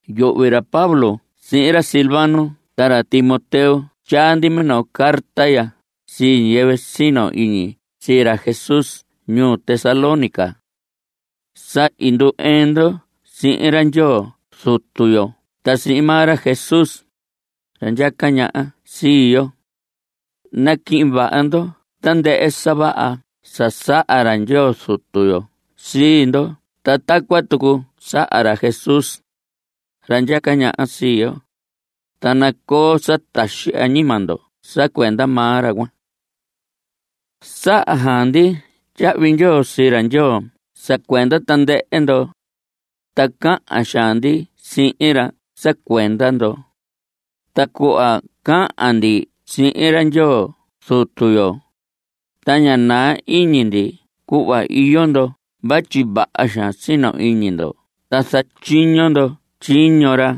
Yuhvi ra Pablo sihin ra Silvano ta ra Timoteo tyaa ndi minoo carta ya sii ñiyɨvɨ sino iñi sii ra Jesús ñuu Tesalónica. Sa i ndu‑ɨɨn ndo sihin ra Ndyoo Zutu yo ta sihin maa ra Jesús, ra ndyaca ñaha sii yo. Naquihin vaha ndo tandɨhɨ sa vaha sa saha ra Ndyoo Zutu yo sii ndo ta tacuan tucu saha ra Jesús, ra ndyaca ñaha sii yo. Ta nacoo sa taxi añima ndo sa cuenda maa ra cuan. Saha xaan ndi tyahvi ndyoo sii ra Ndyoo sa cuenda tandɨhɨ ndo, ta cahan xaan ndi sihin ra sa cuenda ndo. Ta cuhva cahan ndi sihin ra Ndyoo Zutu yo, ta ña naa iñi ndi cuhva iyo ndo vatyi vaha xaan sino iñi ndo ta zatyiño ndo tyiño ra.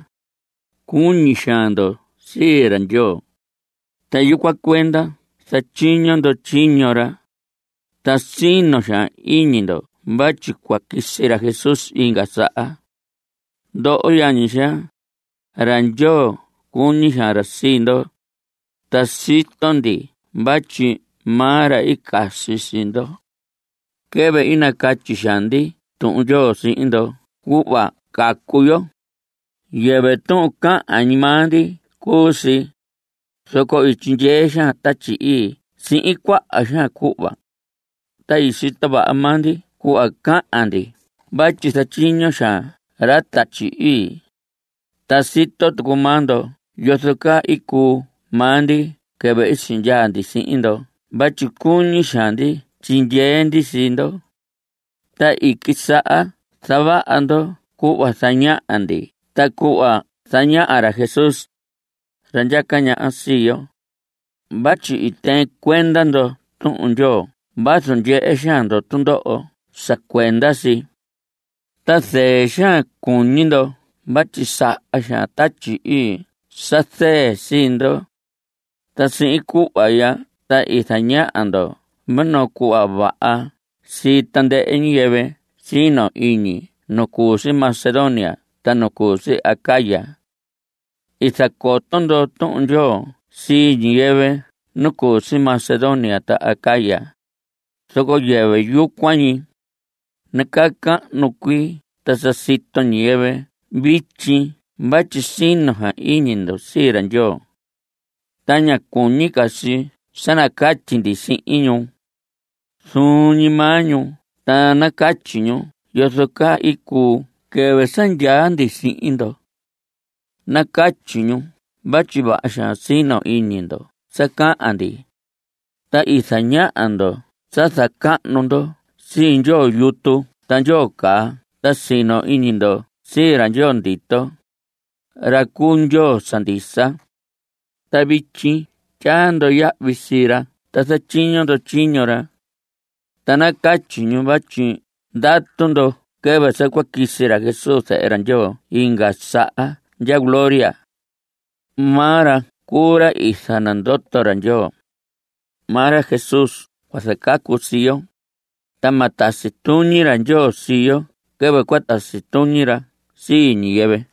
Cuñi xaan ndo sii ra Ndyoo, ta yucuan cuenda zatyiño ndo tyiño ra. Ta sino xaan iñi ndo vatyi cua quisi ra Jesús inga saha. Ndoho yañi xaa, ra Ndyoo cuñi xaan ra sii ndo, ta sito ndi vatyi maa ra i casi sii ndo. Quɨvɨ i nacatyi xaan ndi Tuhun Ndyoo sihin ndo cuhva cacu yo, yɨvɨ tuhun cahan ñi maa ndi cuu si, zoco i tyindyee xaan Tatyi Ii sihin cuaha xaan cuhva. Ta i sito vaha maa ndi cuhva cahan ndi vatyi zatyiño xaan ra Tatyi Ii. Ta sito tucu maa ndo yozo caa i cuu maa ndi quɨvɨ i sindyaa ndi sihin ndo vatyi cuñi xaan ndi tyindyee ndi sii ndo. Ta i quisaha zavaha ndo cuhva zañaha ndi ta cuhva zañaha ra Jesús, ra ndyaca ñaha sii yo, vatyi i tɨɨn cuenda ndo Tuhun Ndyoo vazu ndyehe xaan ndo tundoho sa cuenda si. Ta zɨɨ xaan i cuñi ndo vatyi saha xaan Tatyi Ii sa zɨɨ sii ndo. Ta sihin cuhva ya ta i zañaha ndo minoo cuhva vaha sii tandɨhɨ ñiyɨvɨ sino iñi nu cu si Macedonia ta nu cu si Acaya. I zacoto ndo Tuhun Ndyoo sii ñiyɨvɨ nu cu si Macedonia ta Acaya, zoco yɨvɨ yucuan ñi, nacahnu cuii ta sa sito ñiyɨvɨ vityi vatyi sino xaan iñi ndo sii ra Ndyoo. Ta ña cuñi ca si sa nacatyi ndi sihin ñu. Zuun ñi maa ñu ta nacatyi ñu yozo caa i cuu quɨvɨ sa ndyaa ndi sihin ndo. Nacatyi ñu vatyi vaha xaan i sino iñi ndo sa cahan ndi, ta i zaña ndo sa zacahnu ndo sii ndyoo yutu ta ndyoo caa ta sino iñi ndo sii ra Ndyoo ndito, ra cu Ndyoo sa ndisa. Ta vityi tyaa ndo yahvi sii ra ta zatyiño ndo tyiño ra. Ta nacatyi ñu vatyi ndatu ndo quɨvɨ sa cua quisi ra Jesús zehe Ndyoo inga saha ndya gloria. Maa ra cuu ra i zanandoto ra Ndyoo. Maa ra Jesús cua zacacu sii yo, ta ma tasi tuñi ra Ndyoo sii yo quɨvɨ cua tasi tuñi ra sii ñiyɨvɨ.